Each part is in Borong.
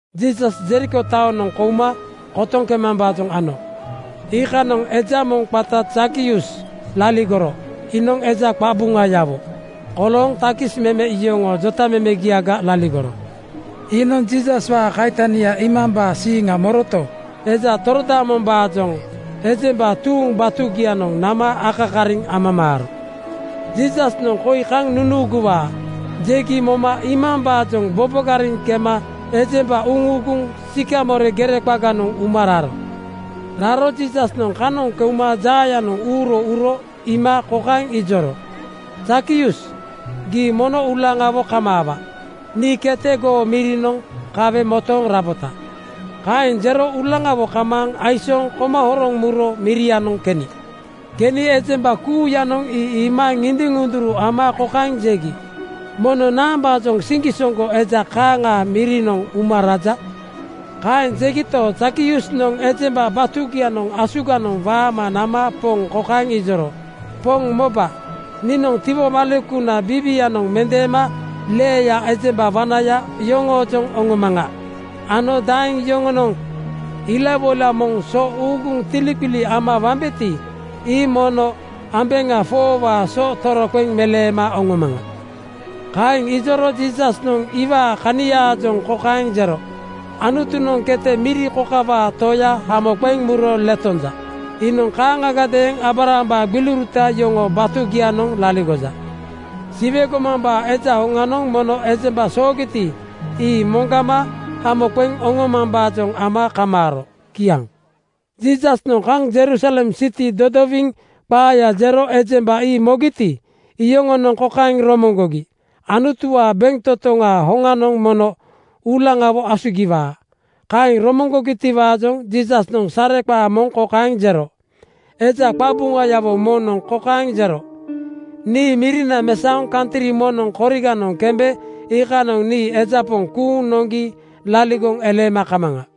Jiisas Jeriko taonoŋ kouma kotoŋ kemambaajoŋ ano. Iikanoŋ eja moŋ qata Zakius laligoro. Iinoŋ eja qabuŋayawo kolooŋ takis meme yoŋoo jotamemegiaga laligoro. Iinoŋ Jiisaswaa kaitania iimambaa siiŋa moroto, eja torodaamombaajoŋ ejemba tuuŋ batugianoŋ nama akakariŋ amamaaro. “Jiisasnoŋ koi kaŋ nunuuguwaa,” jegi moma iimambaajoŋ bobogariŋ kema ejemba uŋuuguŋ Sikamore gere qaganoŋ uma raro. Raro Jiisasnoŋ kanoŋ keuma jaayanoŋ uuro uro iima kokaeŋ ijoro, “Zakius, gii mono uulaŋawo kamaawa. Nii kete goo mirinoŋ kawe motooŋ rabota.” Kaeŋ jero uulaŋawo kamaaŋ aisooŋ koma horoŋ muro mirianoŋ keni. Keni ejemba kuuyanoŋ ii iima ŋindiŋ-ŋunduru ama kokaeŋ jegi, “Mono naambaajoŋ siŋgisoŋgo eja kaaŋaa mirinoŋ uma raja?” Kaeŋ jegito, Zakiusnoŋ ejemba batugianoŋ asuganoŋ waama nama Poŋ kokaeŋ ijoro, “Poŋ moba, niinoŋ tiwomalekuna biiwianoŋ mendeema leeya ejemba wanaya yoŋoojoŋ oŋomaŋa ano daeŋ yoŋoonoŋ ilawoila moŋ so uuguŋ tiliqili ama wambeti, ii mono ambeŋa 4:waa so toroqeŋ meleema oŋomaŋa.” Kaeŋ ijoro Jiisasnoŋ iwaa kaniaajoŋ kokaeŋ jero, “Anutunoŋ kete miri kokawaa toya hamo qeŋ muro letonja. Iinoŋ kaaŋagadeeŋ Aabrahambaa gbiliuruta yoŋoo batugianoŋ laligoja. Siwe gomambaa Eja hoŋanoŋ mono ejemba soogiti, ii moŋgama hamo qeŋ oŋomambaajoŋ ama kamaaro.” Kiaŋ. Jiisasnoŋ kaŋ Jerusalem siti dodowiŋ qaaya jero ejemba ii mogiti, iyoŋonoŋ kokaeŋ romoŋgogi, “Anutuwaa bentotoŋaa hoŋanoŋ mono uulaŋawo asugiwaa.” Kaeŋ romoŋgogitiwaajoŋ Jiisasnoŋ sareqaa moŋ kokaeŋ jero, “Eja qabuŋayawo moŋnoŋ kokaeŋ jero, ‘Nii mirina mesaoŋ kantri moŋnoŋ koriganoŋ kembe iikanoŋ nii eja poŋ kuuŋ noŋgi laligoŋ eleema kamaŋa.’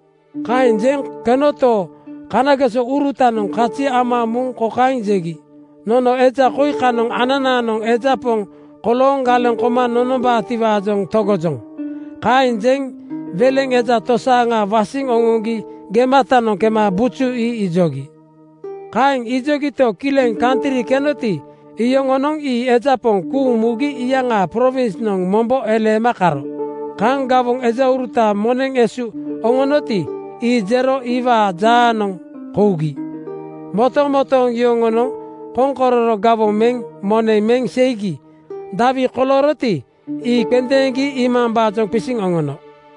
Kaeŋ jeŋ kenoto, kanagesourutanoŋ kazi ama muŋ kokaeŋ jegi, ‘Nono eja koi kanoŋ ananaanoŋ eja poŋ kolooŋ galeŋ koma nonombaatiwaajoŋ togojoŋ.’ Kaeŋ jeŋ weleŋ eja tosaaŋa wasiŋ oŋoŋgi gematanoŋ kema buju ii ijogi. “Kaeŋ ijogito, kileŋ kantri kenoti, iyoŋonoŋ ii eja poŋ kuuŋ mugi iyaŋaa prowinsnoŋ mombo eleema karo. Kaŋ gawoŋ ejauruta moneŋ esu oŋonoti, ii jero iwaa jaanoŋ kougi. Motomotooŋ yoŋonoŋ koŋkororo gawoŋ meŋ moneŋ meŋ seigi dawi kolooroti, ii qendeeŋgi iimambaajoŋ qisiŋ oŋono.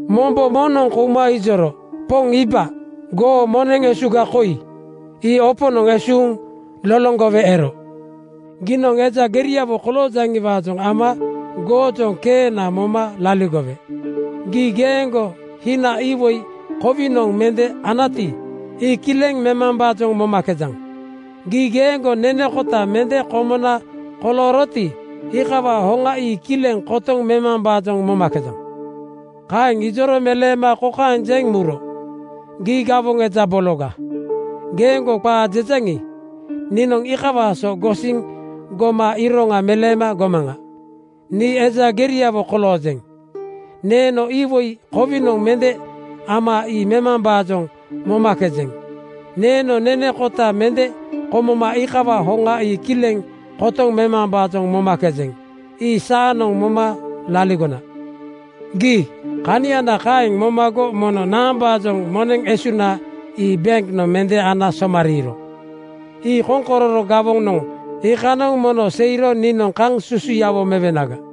“Mombo moŋnoŋ kouma ijoro, ‘Poŋ iiba. Goo moneŋ esuga koi. Ii oponoŋ esuuŋ loloŋgowe ero. Giinoŋ eja geriawo koloojaŋiwaajoŋ ama goojoŋ keena moma laligowe. Gii geeŋgo hina iwoi kowinoŋ mende anati, ii kileŋ memambaajoŋ momakejaŋ. Gii geeŋgo nene kota mende komona kolooroti, iikawaa hoŋa ii kileŋ kotoŋ memambaajoŋ momakejaŋ.’ “Kaeŋ ijoro meleema kokaeŋ jeŋ muro, ‘Gii gawoŋ eja bologa. Geeŋgo qaa jejaŋi, niinoŋ iikawaa so gosiŋ goma iroŋa meleema gomaŋa. Nii eja geriawo koloojeŋ. Neeno iwoi kowinoŋ mende ama ii memambaajoŋ momakejeŋ. Neeno nene kota mende komoma iikawaa hoŋa ii kileŋ kotoŋ memambaajoŋ momakejeŋ. Ii saanoŋ moma laligona. Gii kaniana kaeŋ momago mono naambaajoŋ moneŋ esuna ii benknoŋ mende ana somariiro. Ii koŋkororo gawonoŋ anagati eeŋ, iikanoŋ mono seiro niinoŋ kaŋ susuyawo mewenaga.’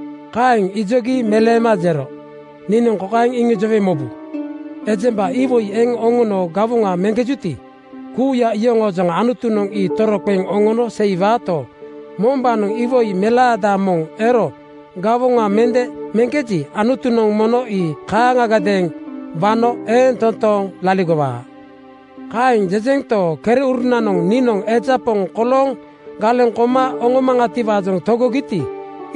Kaeŋ ijogi meleema jero, ‘Niinoŋ kokaeŋ iŋijowe mobu: Ejemba iwoi eŋ oŋono gawoŋa meŋkejuti, kuuya iyoŋoojoŋ Anutunoŋ ii toroqeŋ oŋono seiwaato, mombaanoŋ iwoi melaada moŋ ero gawoŋa mende meŋkeji, Anutunoŋ mono ii kaaŋagadeeŋ wano eeŋ toontooŋ laligowaa.’ Kaeŋ jejento, kereurunanoŋ niinoŋ eja poŋ kolooŋ galeŋ koma oŋomaŋatiwaajoŋ togogiti,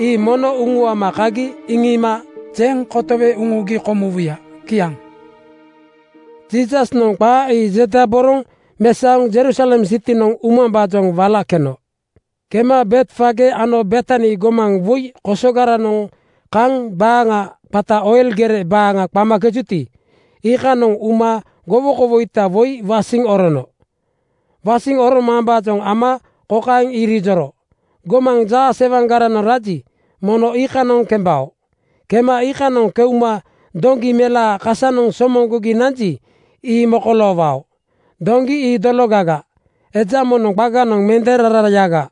ii mono uŋuama kagi iŋiima jeŋ kotowe uŋugi komuwuya.’” Kiaŋ. Jiisasnoŋ qaa ii jedaboroŋ mesaoŋ Jerusalem sitinoŋ umambaajoŋ wala keno. Kema Betfage ano Betani gomaŋ woi kosogaranoŋ kaŋ baaŋa qata Oil gere baaŋa qamakejuti, iikanoŋ uma gowokowoita woi wasiŋ orono. Wasiŋ oromambaajoŋ ama kokaeŋ irijoro, “Gomaŋ jaasewaŋgaranoŋ raji, mono iikanoŋ kembao. Kema iikanoŋ keuma doŋgi melaa kasanoŋ somoŋgogi nanji, ii mokoloowao. Doŋgi ii dologaga, eja moŋnoŋ qaganoŋ mende rarayaga.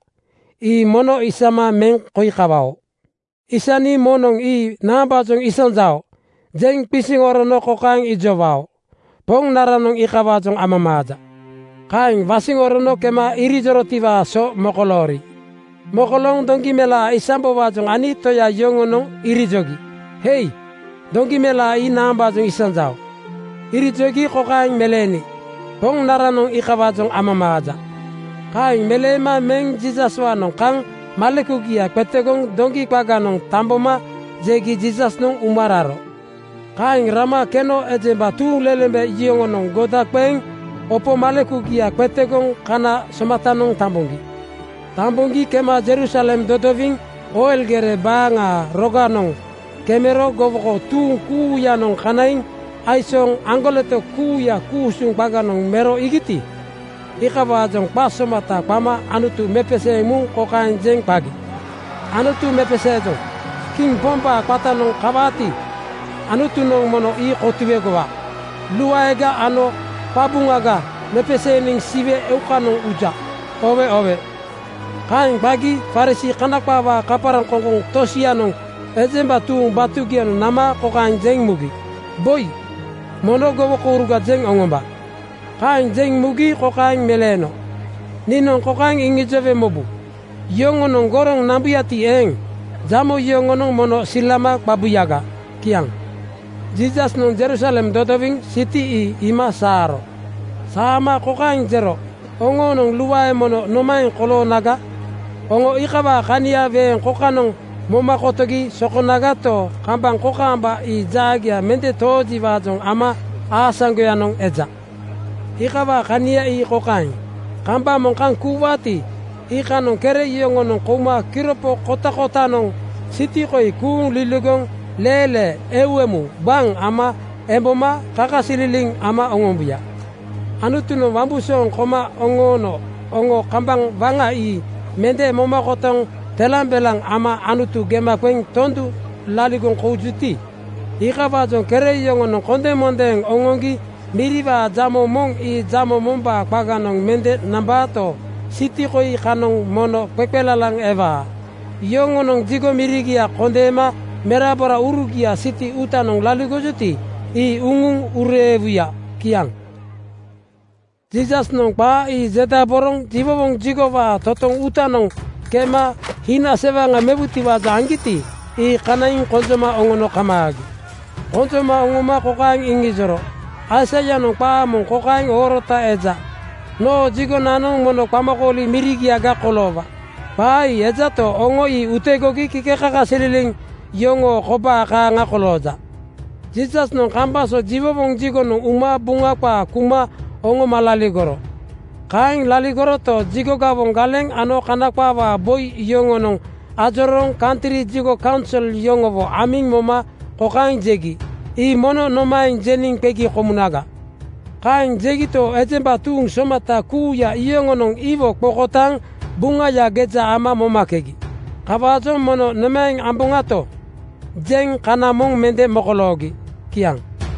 Ii mono isama meŋ koi kawao. Aisni moŋnoŋ ‘Ii naambaajoŋ isanjao?’ jeŋ qisiŋ orono kokaeŋ ijowao, ‘Poŋnaranoŋ iikawaajoŋ amamaaja.’” Kaeŋ wasiŋ orono kema ijorotiwaa so mokoloori. Mokolooŋ doŋgi melaa isambowaajoŋ ani toya yoŋonoŋ irijogi, “Hei! Doŋgi melaa ii naambaajoŋ isanjao?” Irijogi kokaeŋ meleeni, “Poŋnaranoŋ iikawaajoŋ amamaaja.” Kaeŋ meleema meŋ Jiisaswaanoŋ kaŋ malekugia qetegoŋ doŋgi qaganoŋ tamboma jegi Jiisasnoŋ uma raro. Kaeŋ rama keno ejemba tuuŋlelembe yoŋonoŋ goda qeŋ opo malekugia qetegoŋ kana somatanoŋ tamboŋgi. Tamboŋgi kema Jerusalem dodowiŋ Oil gere baaŋaa roganoŋ kemero gowoko tuuŋ kuuyanoŋ kanaiŋ aisooŋ aŋgoleto kuuya ku-usuŋ qaganoŋ mero iigiti, iikawaajoŋa qa somata qama Anutu mepeseeŋ muŋ kokaeŋ jeŋ qagi, “Anutu mepeseejoŋ. Kiŋ Pombaa qatanoŋ kawaati, Anutunoŋ mono ii kotuegowa. Luaega ano qabuŋaga mepeseeniŋ Siwe eukanoŋ uja. Oowe oowe!” Kaeŋ qagi Farisii (Kana qaawaa kaparaŋkoŋkoŋ) tosianoŋ ejemba tuuŋ batugianoŋ nama kokaeŋ jeŋ mugi, “Boi, mono gowokouruga jeŋ oŋomba.” Kaeŋ jeŋ mugi kokaeŋ meleeno, “Niinoŋ kokaeŋ iŋijowe mobu: Yoŋonoŋ goroŋ nambuyagati eeŋ, jamo yoŋonoŋ mono silama qabuyaga.” Kiaŋ. Jiisasnoŋ Jerusalem dodowiŋ siti ii iima saaro. Saama kokaeŋ jero, “Oŋoonoŋ luae mono nomaeŋ koloonaga! Oŋo iikawaa kania weeŋ kokanoŋ moma kotogi sokonagato, kambaŋ kokaamba ii jaagia mende toojiwaajoŋ ama aasaŋgoyanoŋ eja. Iikawaa kania ii kokaeŋ: Kambaŋ moŋ kaŋ kuuwaati, iikanoŋ kere yoŋonoŋ kouma kiropo kotakotanoŋ siti koi kuuŋ liligoŋ leelee eu emu gbaŋ ama emboma kakasililiŋ ama oŋombuya. Anutunoŋ wambusooŋ koma oŋoono oŋo kambaŋ waŋa ii mende moma kotoŋ telambelaŋ ama Anutu gema qeŋ tondu laligoŋ koujuti, iikawaajoŋ kere yoŋonoŋ kondemondeeŋ oŋoŋgi miriwaa jamo moŋ ii jamo mombaa qaganoŋ mende nambaato, siti koi kanoŋ mono qeqelalaŋ ewaa. Yoŋonoŋ jigo mirigia kondeema meraboraurugia siti uutanoŋ laligojuti, ii uŋuŋ ureewuya.” Kiaŋ. Jiisasnoŋ qaa ii jedaboroŋ jiwowoŋ jigowaa totoŋ uutanoŋ kema hina sewaŋa mewutiwaajoŋ aŋgiti, ii kanaiŋ konjoma oŋono kamaagi. Konjoma oŋoma kokaeŋ iŋijoro, “Aisaianoŋ qaa moŋ kokaeŋ oorota eja, ‘Noo jigonanoŋ mono qamakooli mirigiaga koloowa.’ Qaa ii ejato, oŋo ii utegogi kikekakasililiŋ yoŋoo kobaa kaaŋa kolooja.” Jiisasnoŋ kambaŋ so jiwowoŋ jigonoŋ uma Buŋa qaa kuma oŋoma laligoro. Kaeŋ laligoroto, jigo gawoŋ galeŋ ano Kana qaawaa boi yoŋonoŋ ajorooŋ kantri jigo kaunsol yoŋowo amiŋ moma kokaeŋ jegi, “Ii mono nomaeŋ jeniŋ qegi komunaga?” Kaeŋ jegito, ejemba tuuŋ somata kuuya yoŋonoŋ iwo qokotaaŋ Buŋaya geja ama momakegi. Kawaajoŋ “Mono nomaeŋ amboŋato?” jeŋ kana moŋ mende mokoloogi. Kiaŋ.